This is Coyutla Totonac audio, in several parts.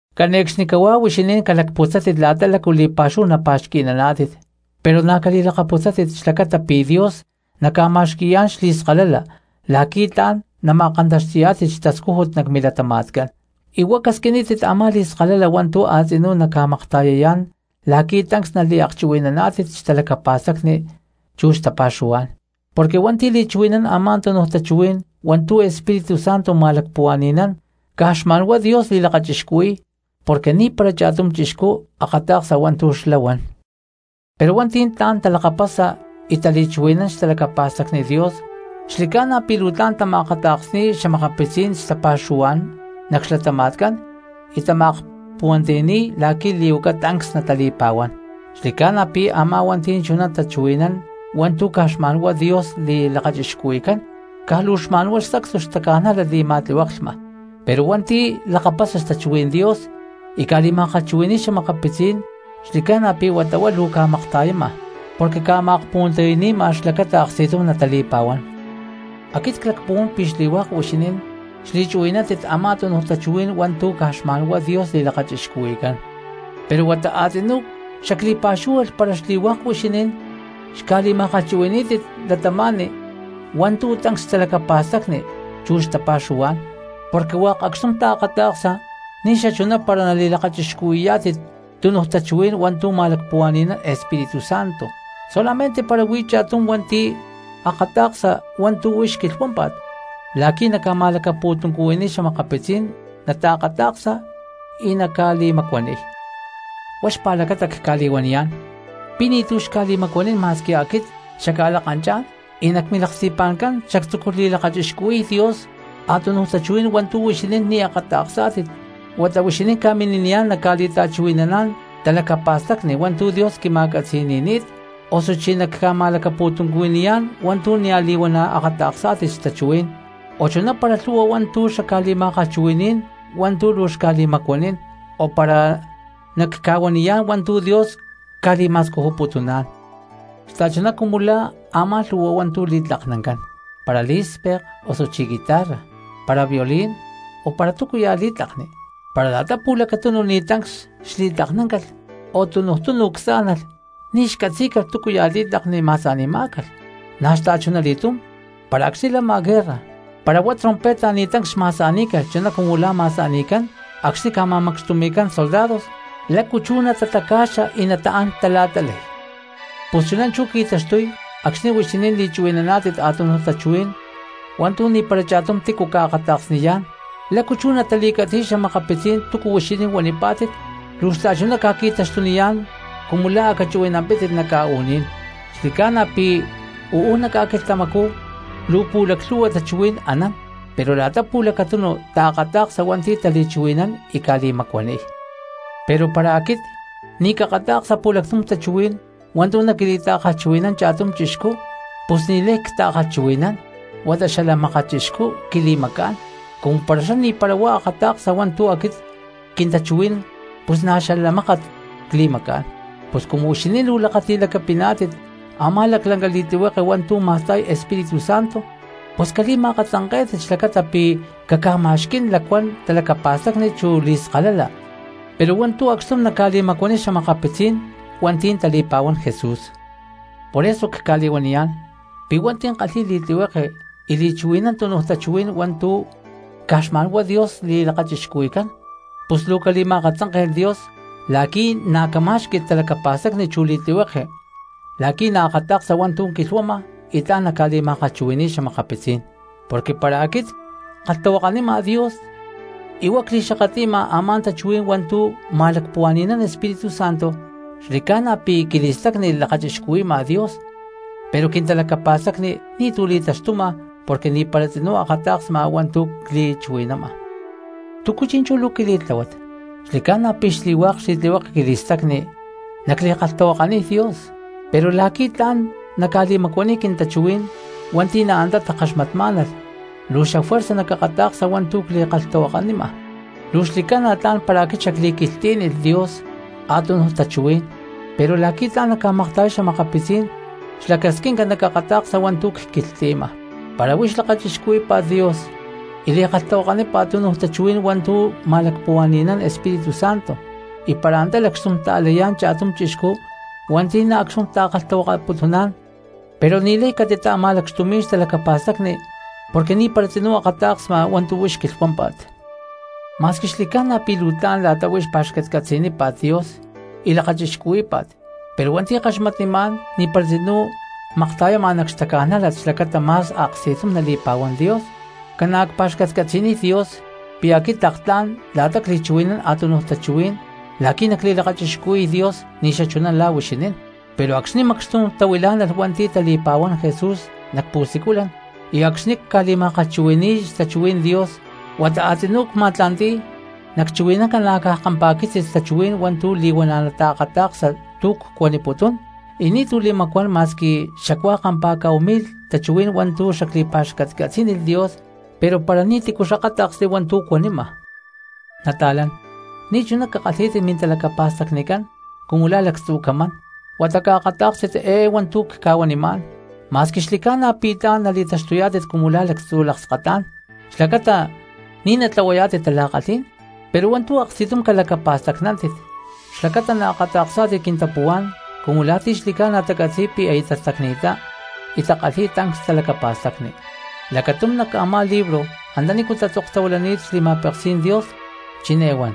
Cane̠cxnicahuá huixinín calacputzátit la̠ta lácu li̠pa̠xúhu napa̠xqui̠naná̠tit, pero na̠ cali̠lakaputzátit xlacata pi̠ Dios naca̠ma̠xqui̠yá̠n xli̠skalala la̠qui̠ tla̠n nama̠kantaxti̠yá̠tit xtascújut nac milatama̠tcán, y huá casquinítit a̠má li̠skalala hua̠ntu̠ a̠tzinú naca̠makta̠yayá̠n la̠qui̠ tancs naliakchuhui̠naná̠tit xtalacapa̠stacni chu xtapa̠xuhuá̠n. Porque hua̠nti̠ li̠chuhui̠nán a̠má túnuj tachuhuí̠n hua̠ntu̠ Espíritu Santo ma̠lacpuhua̠ni̠nán caj xma̠n huá Dios li̠lakachixcuhui̠y porque ni̠para cha̠tum chixcú akata̠ksa hua̠ntu̠ xlá huan. Pero hua̠nti̠ tla̠n talakapasa y tali̠chuhui̠nán xtalacapa̠stacni Dios xli̠ca̠na pi̠ luu tama̠akata̠ksni̠y xa̠makapitzí̠n xtapa̠xuhuá̠n nac xlatama̠tcán y tama̠akpuhuantiyani̠y la̠qui̠ li̠huaca tancs natali̠pa̠huán. Xli̠ca̠na pi̠ a̠má hua̠nti̠ li̠chuhui̠nán tachuhuí̠n hua̠ntu̠ caj xma̠n huá Dios li̠lakachixcuhui̠cán caj luu xma̠n huá sacstu xtaca̠nájlat li̠ma̠tlihueklhma, pero hua̠nti̠ lakapasa xtachuhuí̠n Dios y ca̠li̠ma̠kalhchuhui̠ni̠y xa̠makapitzí̠n cristianos xli̠ca̠na pi̠ huata huá luu ca̠makta̠yama porque ca̠ma̠akpuhuantiyani̠ma xlacata aksti̠tum natali̠pa̠huán. Aquit clacpuhuán pi̠ xli̠hua̠k huixinín xchuhui̠nántit a̠má túnuj tachuhuí̠n hua̠ntu̠ caj xma̠nhuá Dios li̠lakachixcuhui̠cán, pero huata a̠tzinú xacli̠pa̠xúhualh para xli̠hua̠k huixinín xca̠li̠ma̠kalhchuhui̠ní̠tit cristianos hua̠ntu̠ tancs xtalacapa̠stacni chu xtapa̠xuhuá̠n, porque hua̠k acxtum taakata̠ksa ni̠xachuná para nali̠lakachixcuhuí̠yá̠tit túnuj tachuhuí̠n hua̠ntu̠ ma̠lacpuhua̠ni̠nán Espíritu Santo; solamente para huí cha̠tum hua̠nti̠ akata̠ksa hua̠ntu̠ huix quilhuámpa̠t la̠qui̠ naca̠ma̠lacapu̠tuncuhui̠niy xa̠makapitzí̠n naakata̠ksa y naca̠li̠macuaniy. Huá xpa̠lacata cca̠li̠huaniyá̠n pi̠ ni̠tu̠ xca̠li̠macuanín ma̠squi aquit xacca̠lakanchá̠n y nac milaksti̠pa̠ncán xactzúculh li̠lakachixcuhui̠y Dios a̠tunuj tachuhuí̠n hua̠ntu̠ huixinín ni̠ akata̠ksá̠tit, huata huixinín ca̠mini̠niyá̠n nacca̠li̠ta̠chuhui̠naná̠n talacapa̠stacni hua̠ntu̠ Dios quima̠catzi̠ni̠ni̠t, osuchí nacca̠ma̠lacapu̠tuncuhui̠niyá̠n hua̠ntu̠ nia̠ li̠huana̠ akata̠ksá̠tit xtachuhuí̠n, o chuná para lhu̠hua hua̠ntu̠ xacca̠li̠ma̠kalhchuhui̠ní̠n hua̠ntu̠ luu xca̠li̠macuanín, o para nacca̠huaniyá̠n hua̠ntu̠ Dios ca̠li̠ma̠scujuputuná̠n. Xta̠chuná cumu la̠ a̠má lhu̠hua hua̠ntu̠ li̠tlaknancán, para lí̠spek osuchí guitarra, para violín o para túcuya̠ li̠tlakni, para la̠ta pu̠lacatunu ni̠ tancs xli̠tlaknáncalh o tunuj tunu csá̠nalh ni̠ xcatzí̠calh túcuya̠ li̠tlakni ma̠sa̠ni̠má̠calh. Na̠ xta̠chunali̠túm para acxni̠ lama guerra para huá trompeta ni̠ tancs xma̠sa̠ní̠calh chuná cumu la̠ ma̠sa̠ni̠cán acxní ca̠ma̠macxtumi̠cán soldados. ¿Lácu chú natataca̠xa y nataán tala̠ta̠lay? Pus chuná chú qui̠taxtuy acxni̠ huixinín li̠chuhui̠naná̠tit a̠tunuj tachuhuí̠n hua̠ntu̠ ni̠para cha̠tum cristiano ca̠akata̠ksniyá̠n, ¿lácu chú natali̠catzi̠y xa̠makapitzí̠n túcu huixinín huanipá̠tit? Luu xta̠chuná ca̠qui̠taxtuniyá̠n cumu lá a̠ cachuhui̠nampítit nac ca̠u̠ní̠n. Xli̠ca̠na pi̠ uú nac ca̠quilhtamacú luu pu̠laclhu̠hua tachuhuí̠n anán pero la̠ta pu̠lacatunu taakata̠ksa hua̠nti̠ tali̠chuhui̠nán y ca̠li̠macuaniy. Pero para aquit ni̠ cakata̠ksa pu̠lactum tachuhuí̠n hua̠ntu̠ naquili̠ta̠kalhchuhui̠nán cha̠tum chixcú, pus ni̠lay cta̠kalhchuhui̠nán huata xala mákat chixcú quili̠macá̠n, cumu para xlá ni̠para huá akata̠ksa hua̠ntu̠ aquit quintachuhuí̠n pus na̠ xalacmákat cli̠macá̠n. Pus cumu huixinín luu lakati̠lacapiná̠tit a̠má laclanca li̠tlihueke hua̠ntu̠ ma̠sta̠y Espíritu Santo, pus cali̠ma̠akatzanké̠tit xlacata pi̠ caca̠ma̠xquí̠n lacuán talacapa̠stacni chu li̠skalala pero hua̠ntu̠ acxtum naca̠li̠macuaniy xa̠makapitzí̠n hua̠nti̠ tali̠pa̠huán Jesús. Por eso cca̠li̠huaniyá̠n pi̠ hua̠nti̠ kalhi̠y li̠tlihueke y li̠chuhui̠nán tunuj tachuhuí̠n hua̠ntu̠ caj xma̠n huá Dios li̠lakachixcuhui̠cán pus luu cali̠ma̠akatzánke̠lh Dios la̠qui̠ na̠ camá̠xqui̠lh talacapa̠stacni chu li̠tlihueke la̠qui̠ naakata̠ksa hua̠ntu̠ quilhuama y tla̠n naca̠li̠ma̠kalhchuhui̠ni̠y xa̠makapitzí̠n. Porque para aquit ckalhtahuakanima Dios y huá cli̠xakatli̠ma a̠má tachuhuí̠n hua̠ntu̠ ma̠lacpuhua̠ni̠nán Espíritu Santo, xli̠ca̠na pi̠ quili̠stacni lakachixcuhui̠ma Dios pero quintalacapa̠stacni ni̠tu̠ li̠taxtuma porque ni̠para tzinú akata̠ksma hua̠ntu̠ cli̠chuhui̠nama. ¿Túcu chi̠nchú luu quili̠tláhuat? Xli̠ca̠na pi̠ xli̠hua̠k xli̠tlihueke quili̠stacni nacli̠kalhtahuakaniy Dios, pero la̠qui̠ tla̠n nacca̠li̠macuaniy quintachuhuí̠n hua̠nti̠ na̠ antá takaxmatmá̠nalh luu xafuerza nacakata̠ksa hua̠ntu̠ cli̠kalhtahuakanima. Luu xli̠ca̠na tla̠n para aquit xacli̠quilhtlí̠nilh Dios a̠tunuj tachuhuí̠n, pero la̠qui̠ tla̠n nacca̠makta̠yay xa̠makapitzí̠n xlacasquinca nacakata̠ksa hua̠ntu̠ cquilhtli̠ma. Para huix lakachixcuhuí̠pa̠t Dios y li̠kalhtahuakanípa̠t tunuj tachuhuí̠n hua̠ntu̠ ma̠lacpuhua̠ni̠nán Espíritu Santo, y para antá lacxtum ta̠layá̠n cha̠tum chixcú hua̠nti̠ acxtum ta̠kalhtahuakaputuná̠n, pero ni̠lay catita̠ma̠lacxtumí̠n xtalacapa̠stacni porque ni̠para tzinú akata̠ksma hua̠ntu̠ huix quilhuámpa̠t. Ma̠squi xli̠ca̠na pi̠ luu tla̠n la̠ta huix pa̠xcatcatzi̠nípa̠t Dios y lakachixcuhuí̠pa̠t, pero hua̠nti̠ kaxmatnimá̠n ni̠para tzinú makta̠yama nac xtaca̠nájlat xlacata ma̠s aksti̠tum nali̠pa̠huán Dios. Ca̠na̠ cpa̠xcatcatzi̠niy Dios pi̠ aquit tlak tla̠n la̠ta cli̠chuhui̠nán a̠tunuj tachuhuí̠n la̠qui̠ nacli̠lakachixcuhui̠y Dios ni̠xachuná la̠ huixinín, pero acxni̠ macxtum tahuilá̠nalh hua̠nti̠ tali̠pa̠huán Jesús nac pu̠siculan y acxni̠ cca̠li̠ma̠kalhchuhui̠ni̠y xtachuhuí̠n Dios, huata a̠tzinú cma̠tla̠nti̠y nacchuhui̠nán ca̠na̠caj kampa̠quitzis tachuhuí̠n hua̠ntu̠ li̠huana̠ nataakata̠ksa tu̠ cca̠huaniputún y ni̠tu̠ li̠macuán ma̠squi xacuá kampa̠cá̠hu mi̠lh tachuhuí̠n hua̠ntu̠ xacli̠pa̠xcatcatzí̠nilh Dios pero para ni̠tícu xakáta̠ksli hua̠ntu̠ cuanima. Nata̠lán, ni̠chuná cakalhí̠tit mintalacapa̠stacnicán cumu lá lactzu̠ camán huata caakatá̠kstit eé hua̠ntu̠ cca̠huanimá̠n; ma̠squi xli̠ca̠na pi̠ tla̠n nali̠taxtuyá̠tit cumu la̠ lactzu̠ lakskatá̠n xlacata ni̠ natlahuayá̠tit tala̠kalhí̠n, pero hua̠ntu̠ aksti̠tum calacapa̠stacnántit xlacata naakata̠ksá̠tit quintapuhuá̠n cumu la̠ ti̠ xli̠ca̠na tacatzi̠y pi̠ aya tastacni̠ttá y takalhi̠y tancs talacapa̠stacni. Lacatum nac a̠má libro antanícu tatzoktahuilani̠t xli̠ma̠peksí̠n Dios chiné huan: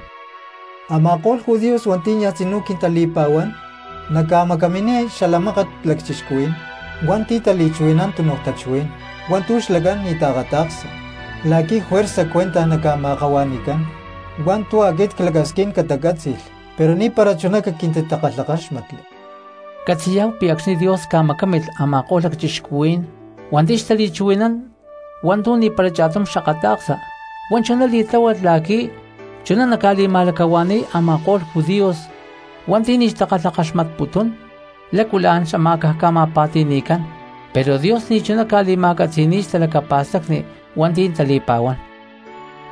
“Ama̠ko̠lh judíos hua̠nti̠ niaj tzinú quintali̠pa̠huán nacca̠macaminiy xala mákat lacchixcuhuí̠n hua̠nti̠ tali̠chuhui̠nán tunuj tachuhuí̠n hua̠ntu̠ xlacán ni̠ taakata̠ksa la̠qui̠ juerza cuentaj naca̠ma̠akahua̠ni̠cán hua̠ntu̠ aquit clacasquín catacátzi̠lh, pero ni̠para chuná caquintitakalhakáxmatli.” Catzi̠yá̠hu pi̠ acxni̠ Dios ca̠macámilh a̠ma̠ko̠lh lacchixcuhuí̠n hua̠nti̠ xtali̠chuhui̠nán hua̠ntu̠ ni̠para cha̠tum xakata̠ksa, huá chuná li̠tláhualh la̠qui̠ chuná naca̠li̠ma̠lacahua̠ni̠y a̠ma̠ko̠lh judíos hua̠nti̠ ni̠ xtakalhakaxmatputún lácu la̠n xamá̠caj ca̠ma̠pa̠ti̠ni̠cán; pero Dios ni̠chuná ca̠li̠ma̠catzi̠ni̠y xtalacapa̠stacni hua̠nti̠ tali̠pa̠huán.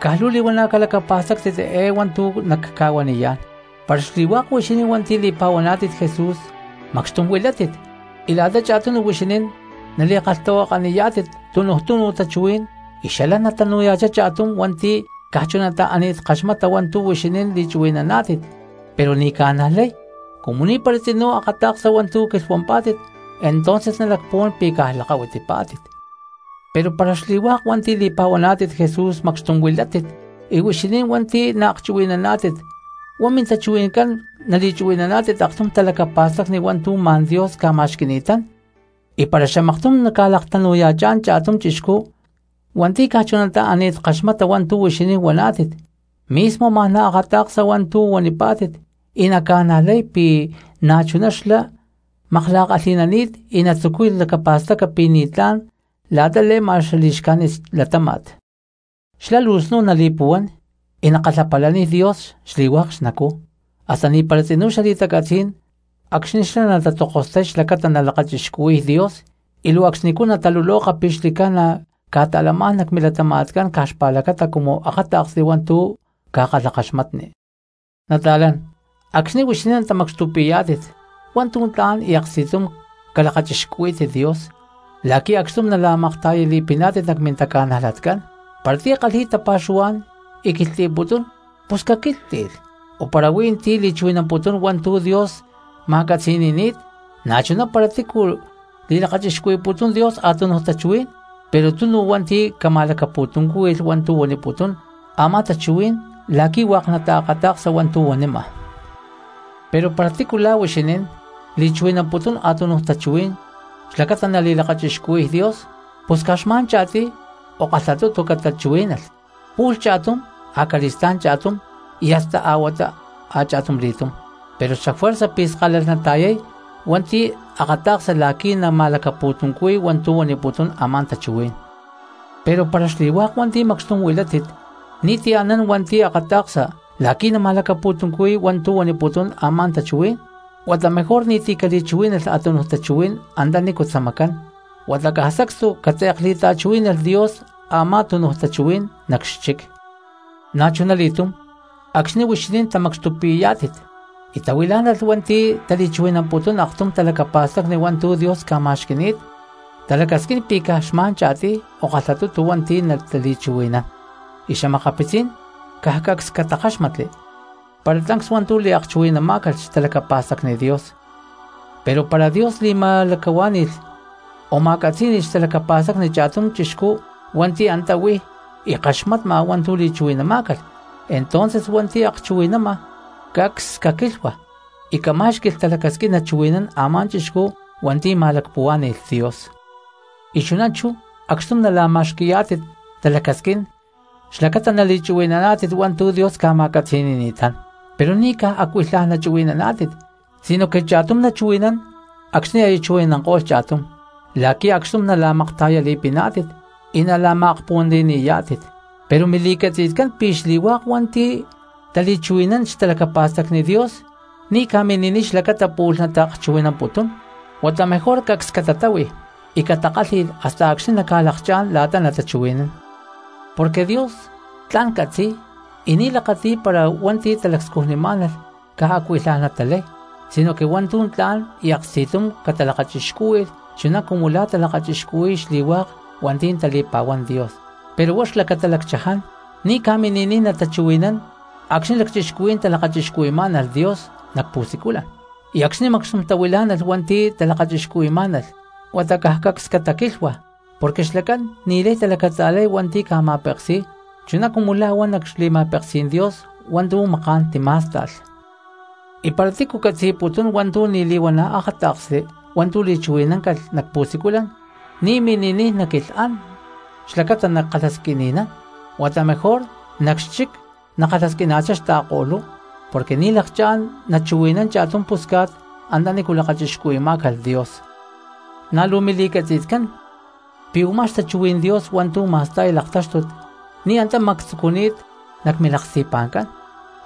Caj luu li̠huana̠ calacapa̠stáctit eé hua̠ntu̠ nacca̠huaniyá̠n, para xli̠hua̠k huixinín hua̠nti̠ li̠pa̠huaná̠tit Jesús macxtum huilátit y la̠ta cha̠tunu huixinín nali̠kalhtahuakaniyá̠tit tunuj tunu tachuhuí̠n y xalán natanu̠ya̠chá cha̠tum hua̠nti̠ caj chunatá ani̠t kaxmata hua̠ntu̠ huixinín li̠chuhui̠naná̠tit pero ni̠ ca̠najlay, cumu ni̠para tzinú akata̠ksa hua̠ntu̠ quilhuampá̠tit entonces nalacpuhuán pi̠ caj lakahuitipá̠tit. Pero para xli̠hua̠k hua̠nti̠ li̠pa̠huaná̠tit Jesús macxtum huilátit y huixinín hua̠nti̠ naakchuhui̠naná̠tit huá mintachuhui̠ncán nali̠chuhui̠naná̠tit aktum talacapa̠stacni hua̠ntu̠ ma̠n Dios ca̠ma̠xqui̠ni̠tán, y para xamaktum naca̠laktanu̠ya̠chá̠n cha̠tum chixcú hua̠nti̠ caj chunatá ani̠t kaxmata hua̠ntu̠ huixinín huaná̠tit, mismo ma̠n naakata̠ksa hua̠ntu̠ huanipá̠tit y naca̠najlay pi̠ na̠chuná xlá makla̠kalhi̠nani̠t y natzucuy lacapa̠staca pi̠ ni̠tlá̠n la̠ta le̠ma xali̠xcájnit xlatáma̠t. Xlá luu snu̠n nali̠puhuán y nakalhapalaniy Dios xli̠hua̠k xnacú, hasta ni̠para tzinú xali̠tacatzí̠n acxni̠ xlá natatzokostay xlacata nalakachixcuhui̠y Dios y luu acxnicú nataluloka pi̠ xli̠ca̠na ca̠ta̠lamá̠n nac milatama̠tcán caj xpa̠lacata cumu akáta̠ksli hua̠ntu̠ ca̠kalhakaxmatni. Nata̠lán, acxni̠ huixinín tamacxtupi̠yá̠tit hua̠ntu̠ tla̠n y aksti̠tum calakachixcuhuí̠tit Dios la̠qui̠ acxtum nala̠makta̠yali̠piná̠tit nac mintaca̠najlatcán. Para ti̠ kalhi̠y tapa̠xuhuá̠n y quilhtli̠putún pus caquílhtli̠lh, o para huí tí li̠chuhui̠namputún hua̠ntu̠ Dios ma̠catzi̠ni̠ni̠t, na̠chuná para tícu li̠lakachixcuhui̠putún Dios a̠tunuj tachuhuí̠n, pero tunu hua̠nti̠ cama̠lacapu̠tuncúhui̠lh hua̠ntu̠ huaniputún a̠má tachuhuí̠n la̠qui̠ hua̠k nataakata̠ksa hua̠ntu̠ huanima. Pero para tícu la̠ huixinín li̠chuhui̠namputún a̠tunuj tachuhuí̠n xlacata nali̠lakachixcuhui̠y Dios, pus caj xma̠n cha̠tiy o kalhatutu catachuhuí̠nalh, pu̠lh cha̠tum acali̠stá̠n cha̠tum, y hasta a̠huatá a̠cha̠tumli̠túm; pero xafuerza pi̠ skalalh nata̠yay hua̠nti̠ akata̠ksa la̠qui̠ nama̠lacapu̠tuncuhui̠y hua̠ntu̠ huaniputún a̠má tachuhuí̠n. Pero para xli̠hua̠k hua̠nti̠ macxtum huilátit ni̠ti̠ anán hua̠nti̠ akata̠ksa la̠qui̠ nama̠lacapu̠tuncuhui̠y hua̠ntu̠ huaniputún a̠má tachuhuí̠n, huata mejor ni̠ti̠ cali̠chuhuí̠nalh a̠tunuj tachuhuí̠n antanícu tzamacán, huata caj sacstu catze̠kli̠ta̠chuhuí̠nalh Dios a̠má tunuj tachuhuí̠n nac xchic. Na̠chunali̠túm acxni̠ huixinín tamacxtupi̠yá̠tit y tahuilá̠nalh hua̠nti̠ tali̠chuhui̠namputún aktum talacapa̠stacni hua̠ntu̠ Dios ca̠ma̠xqui̠ni̠t, talacasquín pi̠ caj xma̠n cha̠tiy o kalhatutu hua̠nti̠ natali̠chuhui̠nán y xa̠makapitzí̠n caj cacs catakáxmatli para tancs hua̠ntu̠ liakchuhui̠namá̠calh xtalacapa̠stacni Dios. Pero para Dios li̠ma̠lacahuá̠ni̠lh o ma̠catzí̠ni̠lh xtalacapa̠stacni cha̠tum cristiano hua̠nti̠ antá huí y kaxmatma hua̠ntu̠ li̠chuhui̠namá̠calh, entonces hua̠nti̠ akchuhui̠nama cacs caquílhua y camá̠xqui̠lh talacasquín nachuhui̠nán a̠má chixcú hua̠nti̠ ma̠lacahuá̠ni̠lh Dios. Y chuná chú acxtum nala̠ma̠xqui̠yá̠tit talacasquín xlacata nali̠chuhui̠naná̠tit hua̠ntu̠ Dios ca̠ma̠catzi̠ni̠ni̠tán, pero ni̠ caj acuilhaj nachuhui̠naná̠tit sinoque cha̠tum nachuhui̠nán, acxní aya chuhui̠nanko̠lh cha̠tum, la̠qui̠ acxtum nala̠makta̠yali̠piná̠tit y nala̠ma̠akpuhuantiyani̠yá̠tit. Pero mili̠catzi̠tcán pi̠ xli̠hua̠k hua̠nti̠ tali̠chuhui̠nán xtalacapa̠stacni Dios ni̠ ca̠mini̠niy xlacata pu̠lh nataakchuhui̠namputún, huata mejor cacs catatáhui y catakálhi̠lh hasta acxni̠ naca̠lakchá̠n la̠ta natachuhui̠nán. Porque Dios tla̠n catzi̠y y ni̠ lakati̠y para hua̠nti̠ talacscujnimá̠nalh caj acuilhaj natalay, sinoque hua̠ntu̠ tla̠n y aksti̠tum catalakachixcúhui̠lh chuná cumu la̠ talakachixcuhui̠y xli̠hua̠k hua̠nti̠ tali̠pa̠huán Dios. Pero huá xlacata lacchaján, ni̠ ca̠mini̠niy natachuhui̠nán acxní lacchixcuhuí̠n talakachixcuhui̠má̠nalh Dios nac pu̠siculan, y acxní macxtum tahuilá̠nalh hua̠nti̠ talakachixcuhui̠má̠nalh huata caj cacs cataquílhua, porque xlacán ni̠lay talacatza̠lay hua̠nti̠ ca̠ma̠peksi̠y chuná cumu la̠ huan nac xli̠ma̠peksí̠n Dios hua̠ntu̠ maká̠n timá̠sta̠lh. Y para túcu catzi̠putún hua̠ntu̠ ni̠ li̠huana̠ akáta̠ksli hua̠ntu̠ li̠chuhui̠namá̠calh nac pu̠siculan, ni̠ mini̠niy naquilhán xlacata nakalhasquini̠nán, huata mejor nac xchic nakalhasquina̠chá xta̠ko̠lú, porque ni̠ lakchá̠n nachuhui̠nan cha̠tum pusca̠t antanícu lakachixcuhui̠má̠calh Dios. Na̠ luu mili̠catzi̠tcán pi̠ u̠má xtachuhuí̠n Dios hua̠ntu̠ ma̠sta̠y laktáxtut ni̠ antá mactzucuni̠t nac milaksti̠pa̠ncán,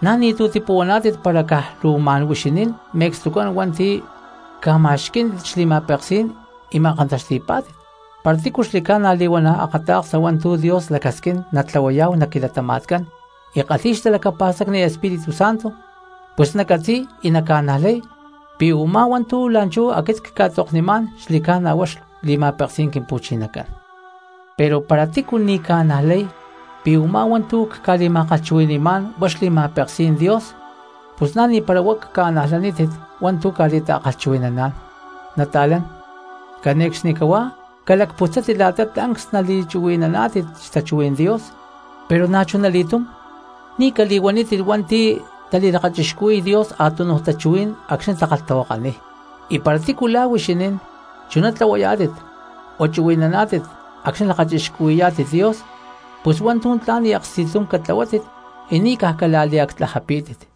na̠ ni̠tu̠ tipuhuaná̠tit para caj luu ma̠n huixinín me̠cstucán hua̠nti̠ ca̠ma̠xquí̠n xli̠ma̠peksí̠n y ma̠kantaxti̠pá̠tit. Para tícu xli̠ca̠na li̠huana̠ akata̠ksa hua̠ntu̠ Dios lacasquín natlahuayá̠hu nac quilatama̠tcán y kalhi̠y xtalacapa̠stacni Espíritu Santo, pus nacatzi̠y y naca̠najlay pi̠ u̠má hua̠ntu̠ la̠nchú aquit cca̠tzoknimá̠n xli̠ca̠na huá xli̠ma̠peksí̠n Quimpu̠chinacán. Pero para tícu ni̠ ca̠najlay pi̠ u̠má hua̠ntu̠ cca̠li̠ma̠kalhchuhui̠ni̠má̠n huá xli̠ma̠peksí̠n Dios, pus na̠ ni̠para huá caca̠najlanítit hua̠ntu̠ ca̠li̠ta̠kalhchuhui̠naná̠n. Nata̠lán, cane̠cxnicahuá calacputzátit la̠ta tancs nali̠chuhui̠naná̠tit xtachuhuí̠n Dios, pero na̠chuna li̠túm ni̠ cali̠huanítit hua̠nti̠ tali̠lakachixcuhui̠y Dios a̠tunuj tachuhuí̠n acxní takalhtahuakaniy. Y para tícu la̠ huixinín chuná tlahuayá̠tit o chuhui̠naná̠tit acxni̠ lakachixcuhui̠yá̠tit Dios, pus hua̠ntu̠ tla̠n y aksti̠tum catlahuátit y ni̠ caj cala̠liactlajapí̠tit.